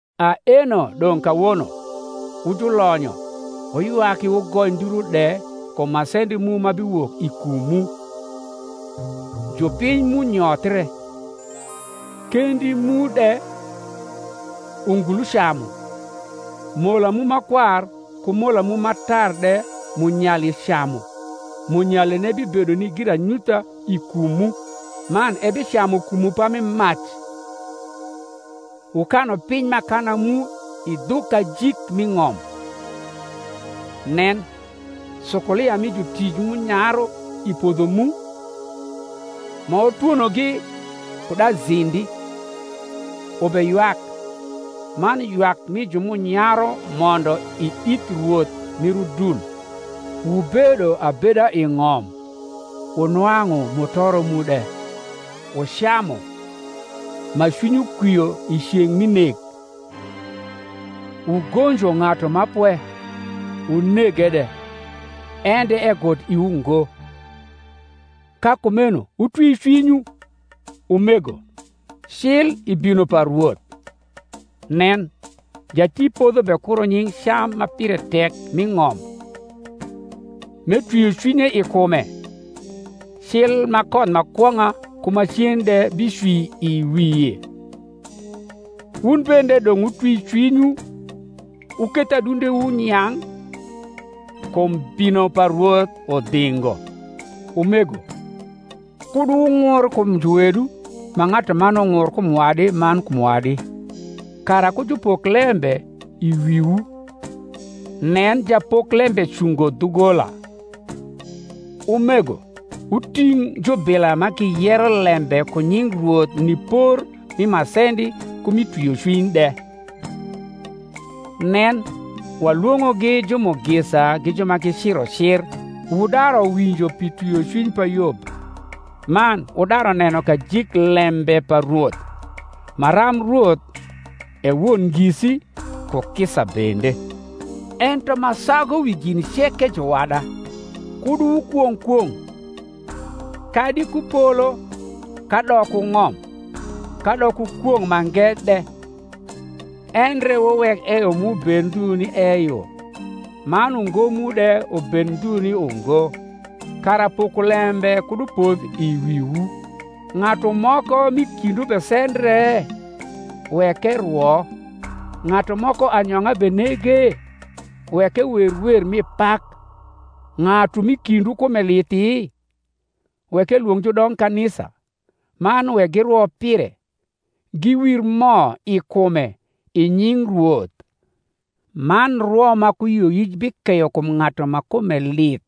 Aeno dong’ kawono, wu julonyo, wuywaki wugoi nduru de kum masendi mu ma biwok i kumwu. Jupiny mu nyothre, kendi mu de ungulu camu. Mola mu ma kwar ku mola mu ma tar de munyali camu: munyaline bibedo ni giranyutha i kumwu, man ebicamu kumwu pami mac. Wukanu piny m’akana mu i dhu kajik mi ng’om. Nen, sukulia mi jutic m’unyaru i podho mu, ma wutwonogi kud azindi, ubeywak: man ywak mi ju m’unyaru mondo i ith Rwoth mir udul. Wubedo abeda i ng’om, wunwang’u mutoro mu de; wucamu ma cwinywu kwio i ceng’ mi nek. Wugonjo ng’atu ma pwe, wunege de; en de egut iwu ngo. Ka kumeno wutwi cwinywu, umego, cil i bino pa Rwoth. Nen, jatipodho bekuro nying’ cam ma pire tek mi ng’om, m’etwio cwinye i kume, cil ma koth ma kwong’a ku macen de bicwi i wie. Wun bende dong’ wutwi cwinywu; wuketh adundewu nyang’: kum bino pa Rwoth udhingo. Umego, kud wung’ur kum juwedu ma ng’atuman ung’ur kum wadi man kum wadi, kara ku jupok lembe i wiwu: nen, japoklembe cungo dhugola. Umego, wuting’ jubila ma giyero lembe ku nying Rwoth ni por mi masendi ku mi twiocwiny de. Nen, walwong’ogi jumugisa gi ju ma giciro cir: wudaru winjo pi twiocwiny pa Yob, man wudaru neno kajik lembe pa Rwoth, maram Rwoth e won ngisi, ku kisa bende. Ento ma sagu wi gin ceke, juwada, kud wukwong’ kwong’, kadi ku polo, kadok ku ng’om, kadok ku kwong’ mange de: endre wuwek eyo mu bed ndhu ni eyo, man ungo mu de ubed ndhu ni ungo; kara pokolembe kud upodh i wiwu. Ng’atu moko m’i kindwu besendre? wek erwo. Ng’atu moko anyong’a benege? wek ewer wer rni pak. Ng’atu m’i kindwu kume lithi? wek elwong’ judongkanisa: man wek girwo pire, giwir mo i kume i nying Rwoth: man rwo ma ku yioyic bikeyo kum ng’atu ma kume lith,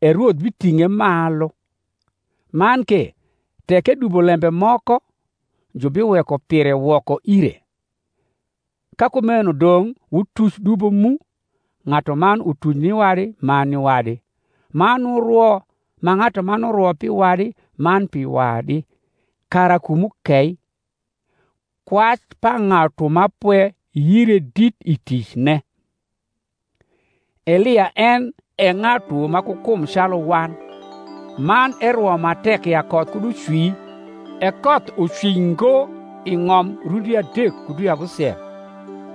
e Rwoth biting’e malu; man ke tek edubo lembe moko, jubiweko pire woko ire. Ka kumeno dong’ wutuc dubo mu ng’atuman utuc ni wadi man ni wadi, man wurwo ma ng’atuman urwo pi wadi man pi wadi, kara kumwu kei. Kwac pa ng’atu ma pwe yire dit i ticne. Elia en e ng’atu ma ku kum calu wan, man erwo ma tek ya koth kud ucwi; e koth ucwi ngo i ng’om rundi adek ku dwi abusiel.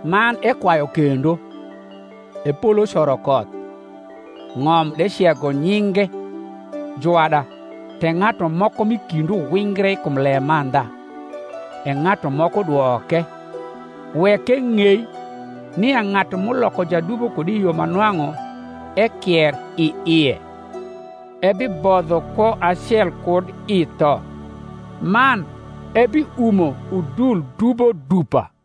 Man ekwayu kendo; e polo coro koth, ng’om de cego nyinge. Juwada, tek ng’atu moko m’i kindwu wingre kum lemandha, e ng’atu moko dwoke; wek eng’ei, nia ng’atu m’uloko jadubo kud i yo ma nwang’u ekier i ie, ebibodho kwo acel kud i tho, man ebiumo udul dubo dupa.